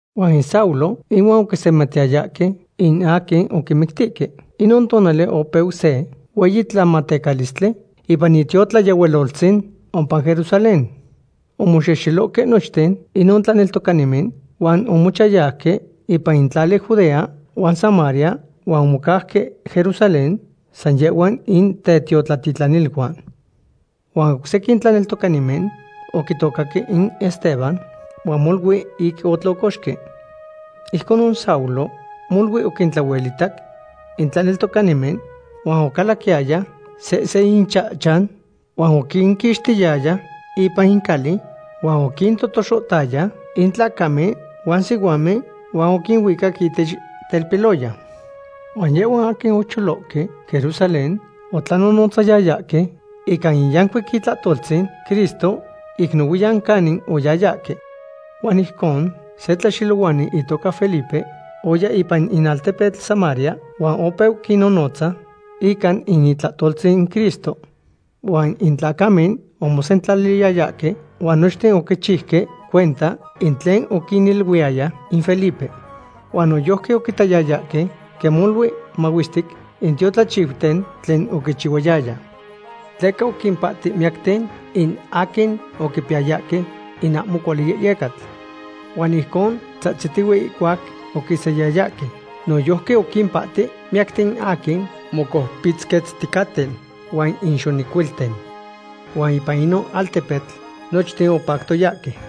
Huan Saulo ihuan oquisematiyayahque in aquin oquimictihque. Inon tonali opeu se hueyi tlamatecalistli ipan itiotlayehualoltzin ompa Jerusalén. Omoxexelohque nochten inon tlaneltocanimen huan omochayauque ipan in tlali Judea huan Samaria, huan omocauque Jerusalén san yehhuan in tetiotlatitlaniluan. Huan oc sequin tlaneltocanimen oquitocaque in Esteban huan molui ic otlocoxque. Ijconon Saulo molui oquintlahuelitac in tlaneltocanimen, huan ocalaquiyaya sehse inchahchan huan oquinquixtiyaya ipan cali huan oquintotoxohtaya in tlacamen huan sihuamen, huan oquinuicac ihtech telpiloyan. Huan yehhuan aquin ocholohque Jerusalén otlanonotzayayahque ica in yancuic itlahtoltzin Cristo ic nohuiyan canic oyayahque. Huan ijcon se tlaxelohuani itoca Felipe oya ipan in altepetl Samaria huan opeu quinnonotza ica in itlahtoltzin Cristo. Huan in tlacamen omosentlaliyayahque huan nochten oquichiuque cuenta in tlen oquiniluiyaya in Felipe. Huan noyojqui oquitayayahque quen molui mahuestic in tiotlachiuten tlen oquichihuayaya. Tleca oquimpahti miyacten in aquin oquipiyayahque in ahmo cuali yehyecatl. Huan ijcon tzahtzitihue ihcuac oquisayayahque. Noyojqui oquimpahti miyacten aquin mocoupitzquetzticaten huan in xonecuilten. Huan ipan inon altepetl nochten opactoyahque.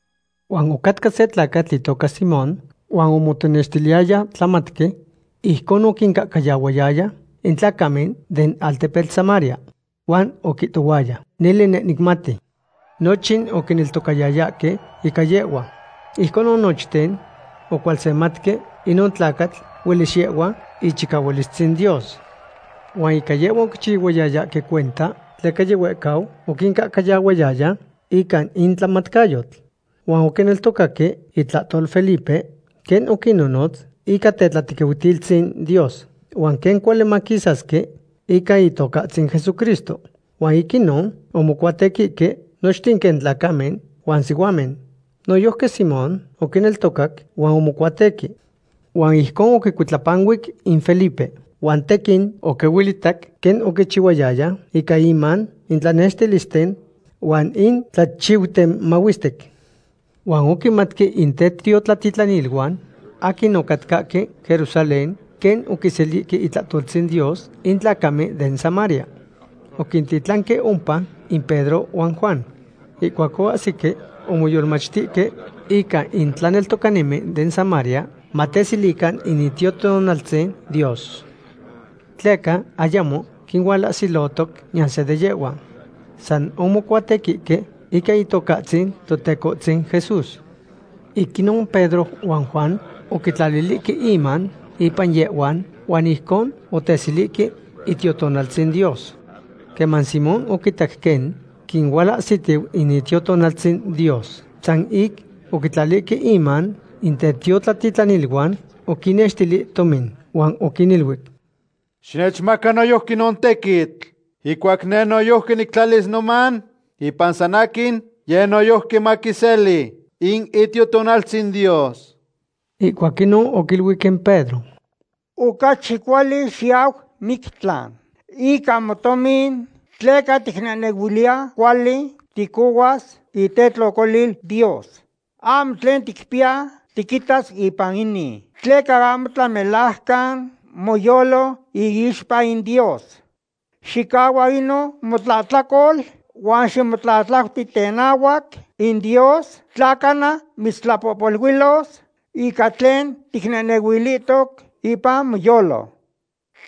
Huan ocatca se tlacatl itoca Simón. Huan omotenextiliyaya tlamatqui. Ijcon oquincahcayahuayaya in tlacamen den altepetl Samaria. Huan oquihtohuaya: “Nele neh nicmati.” Nochin oquineltocayayahque ica yehhua. Ijconon nochten ocualsematque inon tlacatl huelis yehhua ichicahualistzin Dios. Huan ica yehhua oquichihuayayahque cuenta, tleca yihuehcau oquincahcayahuayaya ica in tlamatcayotl. Huan oquineltocaque itlahtol Felipe, quen oquinnonotz ica tetlatequiutilistzin Dios huan quen cuali maquisasque ica Itocahtzin Jesucristo. Huan ic inon omocuatequihque nochten quen tlacamen huan sihuamen. Noyojqui Simón oquineltocac huan omocuatequi. Huan ijcon oquicuitlapanuic in Felipe, huan tequin oquihuelitac quen oquichihuayaya ica iman in tlanextilisten huan in tlachiuten mahuestic. Huan oquimatque in tetiotlatitlaniluan aquin ocatcahque Jerusalén quen oquiselihque itlahtoltzin Dios in tlacamen den Samaria. Oquintitlanque ompa in Pedro huan Juan. Ihcuac oahsihque, omoyolmachtihque ica in tlaneltocanimen den Samaria, mateselican in Itiotonaltzin Dios. Tleca ayamo quinualahsilotoc niyan se de yehhuan. San omocuatequihque ica Itocahtzin Totecohtzin Jesús. Ic inon Pedro huan Juan oquitlalihque inman ipan yehhuan, huan ijcon oteselihque Itiotonaltzin Dios. Queman Simón oquitac quen quinualahsitiu in Itiotonaltzin Dios san ic oquitlalihque inman in tetiotlatitlaniluan, oquinnextili tomin, huan oquiniluic: ―Xinechmaca noyojqui inon tequitl. Ihcuac neh noyojqui nictlalis noman ipan san aquin, yeh noyojqui maquiseli in Itiotonaltzin Dios. Ihcuac inon oquiluic in Pedro: ―Ocachi cuali xiyau mictlan ican motomin tleca ticnehnehuiliya cuali ticohuas itetlocolil Dios. Ahmo tlen ticpiya tiquitas ipan inin, tleca ahmo tlamelajcan moyolo iixpa in Dios. Xicahua inon motlahtlacol huan ximotlatlauti tenahuac in Dios tla cana mitztlapohpoluilos ica tlen ticnehnehuilihtoc ipan moyolo.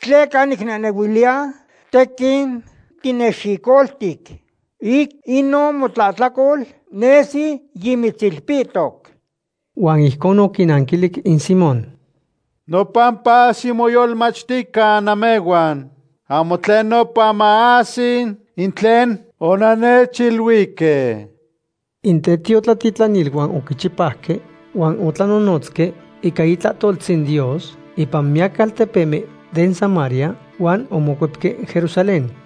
Tleca nicnehnehuiliya tequin tinexicoltic. Ic inon motlahtlacol nesi yimitzilpihtoc. Huan ijconon oquinanquilic in Simón: ―Nopampa ximoyolmachtican namehhuan, ahmo tlen nopa maahsi in tlen onannechiluihque. In tetiotlatitlaniluan oquichipauque huan otlanonotzque ica itlahtoltzin Dios ipan miyac altepemen den Samaria, huan omocuepque Jerusalén.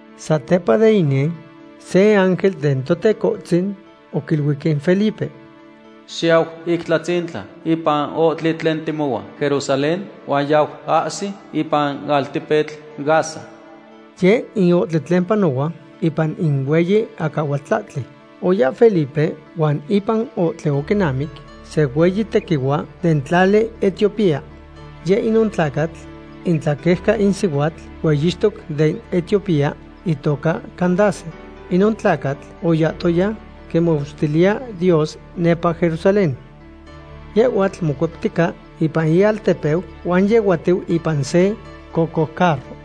Satepa de inin, se ángel den Totecohtzin oquiluic in Felipe: ―Xiyau ic tlahtzintla ipan ohtli tlen temohua Jerusalén huan yau ahsi ipan altepetl Gaza. Yeh in ohtli tlen panohua ipan in hueyi acahualtlahtli. Oya Felipe huan ipan ohtli oquinamic se hueyi tequihua den tlali Etiopía. Yeh inon tlacatl itlaeucau in sihuatl hueyixtoc den Etiopía itoca Candace. Inon tlacatl oyahtoya quimahuestiliya Dios nepa Jerusalén. Yehhuatl mocueptica ipan ialtepeu, huan yehuatiu ipan se cocoucarro.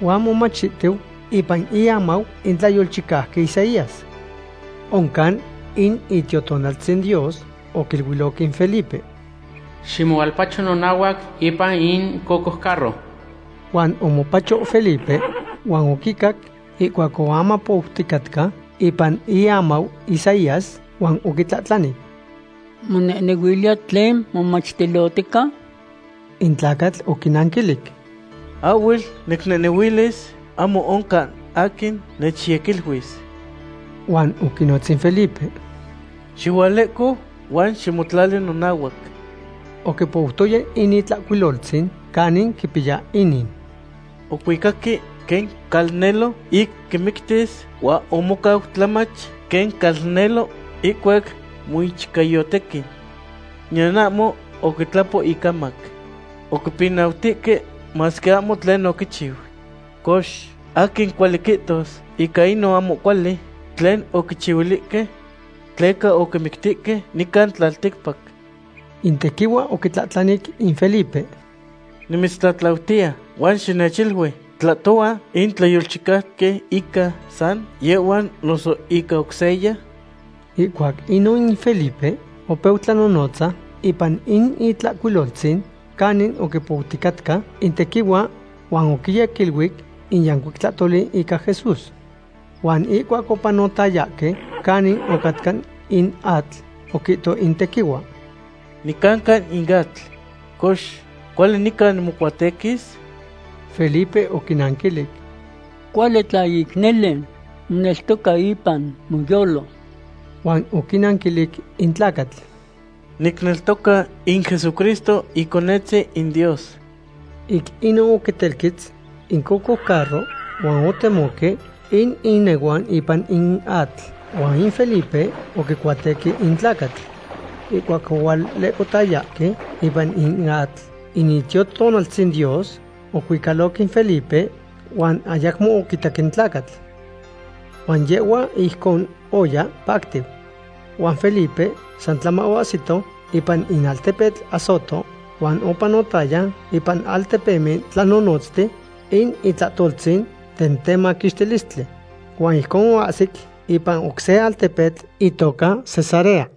Huan momachtihtiu ipan iamau in tlayolchicauqui Isaías. Oncan in Itiotonaltzin Dios oquiluiloc in Felipe: ―Ximohualpacho nonahuac ipan in cocoucarro. Huan omopacho Felipe huan oquicac ihcuac oamapouticatca ipan iamau Isaías, huan oquitlahtlani: ―¿Monehnehuiliya tlen momachtilohtica? In tlacatl oquinanquilic: ―Ahhuel nicnehnehuilis; ahmo oncan aquin nechyequiluis. Huan oquinotz in Felipe: ―Xihualehco huan ximotlali nonahuac. Oquipoutoya in Itlahcuiloltzin canin quipiya inin: Ocuicaque quen calnelo ic quimictis, huan omocau tlamach quen calnelo ihcuac moichcayotequi. Niyan ahmo oquitlapo icamac. Oquipinautihque masque ahmo tlen oquichiu. Cox, ¿aquin cuali quihtos ica inon ahmo cuali tlen oquichihuilihque? Tleca oquimictihque nican tlalticpac. In tequihua oquitlahtlanic in Felipe: ―Nimitztlatlautiya, huan xinechilui; ¿tlahtohua in tlayolchicauqui ica san yehhua noso ica oc seya? Ihcuac inon in Felipe opeu tlanonotza ipan in Itlahcuiloltzin canin oquipouticatca in tequihua huan oquiyequiluic in yancuic tlahtoli ica Jesús. Huan ihcuac opanotayahque canin ocatca in atl, oquihto in tequihua: ―Nicanca in atl. Cox, ¿cuali nica nimocuatequis? Felipe oquinanquilic: ―Cuali tla ic nele moneltoca ipan moyolo. Huan oquinanquilic in tlacatl: ―Nicneltoca in Jesucristo Iconetzin in Dios. Ic inon oquitelquetz in cocoucarro huan otemohque in inehuan ipan in atl huan in Felipe oquicuatequi in tlacatl. Ihcuac ohualehcotayahque ipan in atl in Itiotonaltzin Dios ocuicaloc in Felipe, huan ayacmo oquitac in tlacatl. Huan yehhua ijcon oya pactiu. Huan Felipe san tlama oahsihto ipan in altepetl Azoto, huan opanotaya ipan altepemen tlanonotztiu in itlahtoltzin den temaquixtilistli. Huan ijcon oahsic ipan oc se altepetl itoca Cesarea.